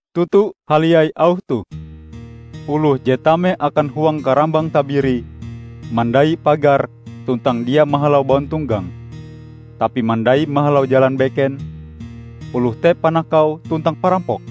"Toto haliai auh toh: Oloh je tame akan huang karambang tabiri mandai pagar tuntang dia mahalau bauntonggang, tapi mandai mahalau jalan beken, oloh te panakau tuntang parampok.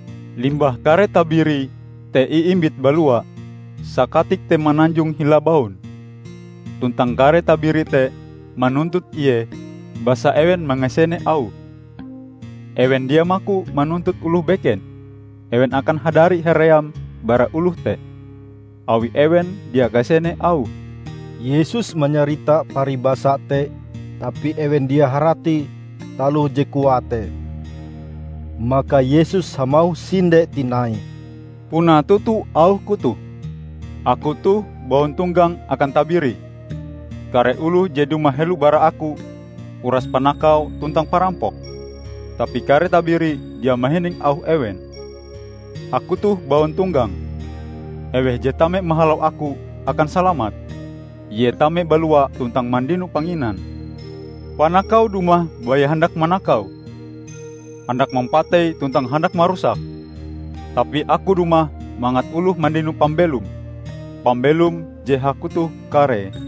Limbah kare tabiri te iimbite balua, sakatik te mananjong hila baun, tuntang kare tabiri te manuntut ie basa ewen mangasene auhe. Ewen dia maku manuntut oloh beken, ewen akan hadari haream bara oloh te, awi ewen dia kasene auhe." Yesus manyarita paribasa te tapi ewen dia harati taloh je koae te. Maka Yesus hamauh sinde tinai, "Puna toto auh-Ku toh: Aku toh bauntonggang akan tabiri. Kare oloh je dumah helo bara Aku, uras panakau tuntang parampok, tapi kare tabiri dia mahining auh ewen. Aku toh bauntonggang. Eweh je tame mahalau Aku, akan salamat; ie tame-balua tuntang mandino panginan. Panakau dumah baya handak manakau, handak mampatei tuntang handak marusak. Tapi Aku dumah mangat oloh mandino pambelom -- pambelom je hakutoh karee.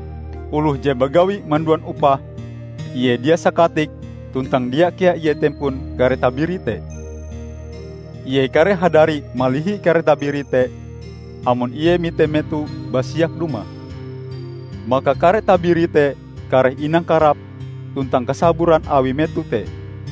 Oloh je bagawi manduan upah ie dia sakatik tuntang dia kea ie tempon kare tabiri te, ie kareh hadari malihi kare tabiri te amon ie mite meto basiak dumah. Maka kare tabiri te kareh inangkarap tuntang kasaburan awi meto te.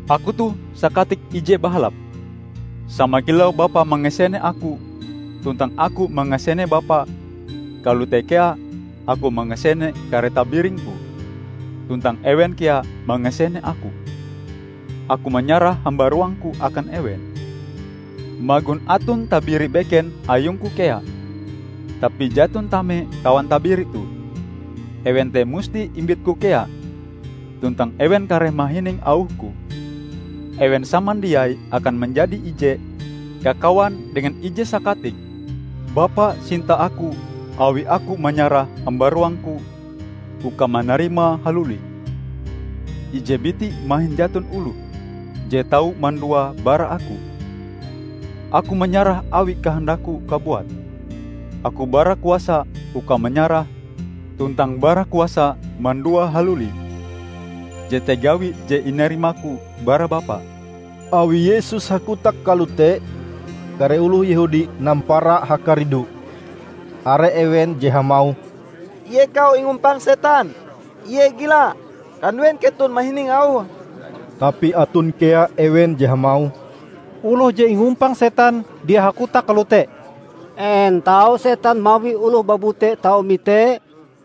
Aku toh Sakatik ije bahalap. Sama kilau Bapa mangasene Aku tuntang Aku mangasene Bapa, kalote kea Aku mangasene kare tabiring-Ku tuntang ewen kea mangasene Aku. Aku manyarah hambaruang-Ku akan ewen. Magon aton tabiri beken ayung-Ku kea, tapi jaton tame kawan tabiri toh. Ewen te musti imbit-Ku kea tuntang ewen kareh mahining auh-Ku. Ewen samandiai akan manjadi ije kakawan dengan ije Sakatik. Bapa sinta Aku awi Aku manyarah hambaruang-Ku, uka manarimae haluli. Ije biti mahin jaton oloh je tau manduae bara Aku. Aku manyarahe awi kahandakku kabuat. Aku bara kuasa uka manyarahe tuntang bara kuasa manduae haluli. Jete gawi je inarima-Ku bara Bapa." Awi Yesus hakotak kalote, kare oloh Yehudi nampara hakaridu. Are ewen je hamauh, "Ie kau ingumpang setan! Ie gila! Kanduen keton mahining auhe?" Tapi aton kea ewen je hamauh, "Oloh je ingumpang setan dia hakotak kalote! En tau setan mawi oloh babute tau mite?"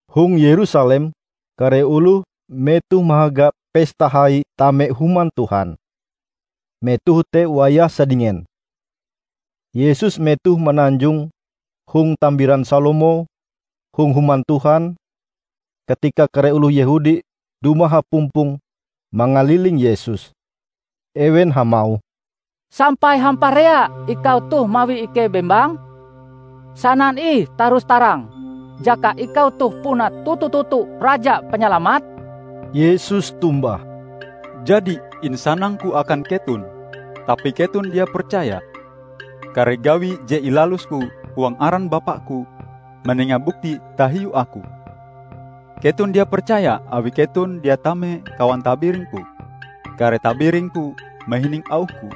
Hong Yerusalem, kare oloh metoh mahaga Pesta Hai Tame Human Tuhan. Metoh te wayah sadingen. Yesus metohe mananjong hong Tambiran Salomo hong Human Tuhan, katika kare oloh Yehudi dumah hapumpong mangaliling Yesus. Ewen hamauh, "Sampai hamparea ikau toh mawi ikei bembang? Sanan ih tarus-tarang, jaka ikau toh puna toto-toto Raja Panyalamat." Yesus tombah, "Jadi insanang-Ku akan keton, tapi keton dia percaya. Kare gawi je ilalus-Ku huang aran Bapa-Ku, manenga bukti tahiu Aku. Keton dia percaya awi keton dia tame kawan tabiring-Ku. Kare tabiring-Ku mahining auh-Ku.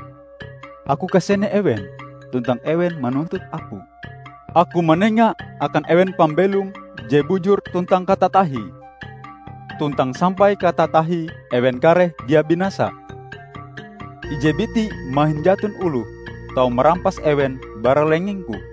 Aku kasene ewen, tuntang ewen manuntut Aku. Aku manenga akan ewen pambelom je bujur tuntang katatahie, tuntang sampai katatahie ewen kareh dia binasa. Ije biti mahin jaton oloh tau marampas ewen bara lengeng-Ku.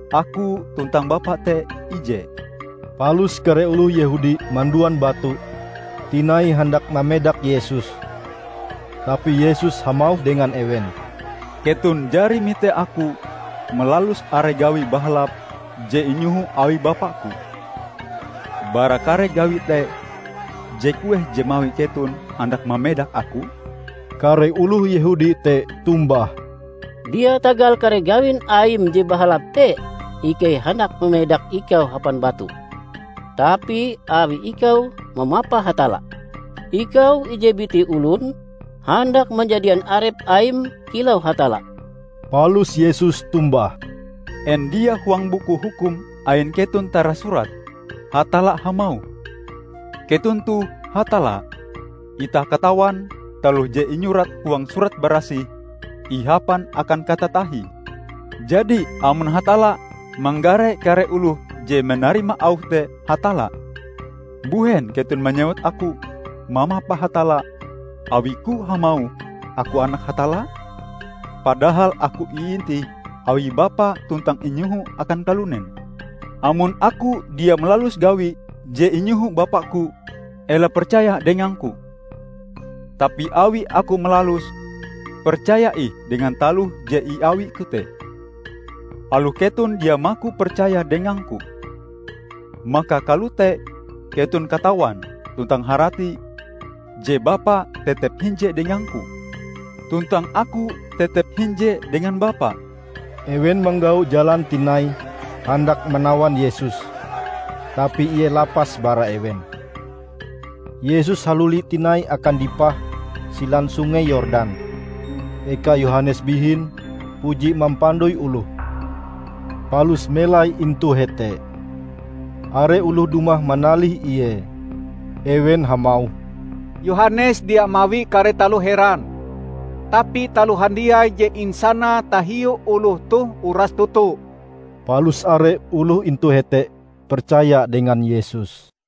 Aku tuntang Bapa te ije." Palus kare oloh Yehudi manduan batu tinai handak mamedak Yesus. Tapi Yesus hamauh dengan ewen, "Keton jari mite Aku malalus are gawi bahalap je inyoho awi Bapa-Ku. Bara kare gawi te, je kueh je mawi keton handak mamedak Aku?" Kare oloh Yehudi te tombah, "Dia tagal kare gawin Aim je bahalap te ikei handak mamedak ikau hapan batu, tapi awi ikau mamapa Hatalla. Ikau ije biti olon, handak manjadian arep Aim kilau Hatalla." Palus Yesus tombah, "En dia huang Buku Hukum ain keton tarasurat: Hatalla hamauh, 'Keton toh hatalla'? Itah katawan, taloh je inyurat huang Surat Barasih ihapan akan katatahie. Jadi amon Hatalla manggare kare oloh je manarima auhe te 'hatalla', mbuhen keton manyewut Aku mamapa Hatalla awi-Ku hamauh Aku Anak Hatalla? Padahal Aku iintih awi Bapa tuntang inyoho akan kalunen. Amon Aku dia malalus gawi je inyoho Bapa-Ku, ela percaya dengang-Ku. Tapi awi Aku malaluse, percaya ih dengan taloh je iawi-Ku te, aloh keton dia maku percaya dengang-Ku. Maka kalote keton katawan tuntang harati je Bapa tetep hinje dengang-Ku, tuntang Aku tetep hinje dengan Bapa." Ewen manggau jalan tinai handak manawan Yesus, tapi Ie lapas bara ewen. Yesus haluli tinai akan dipah Silan Sungei Yordan, eka Yohanes bihin puji mampandoi oloh, palus melai intu hete. Are oloh dumah manalih Ie. Ewen hamauh, "Yohanes dia mawi kare taloh heran, tapi taloh handiai je insanae tahiu oloh toh uras toto." Palus are oloh intu hete percaya dengan Yesus.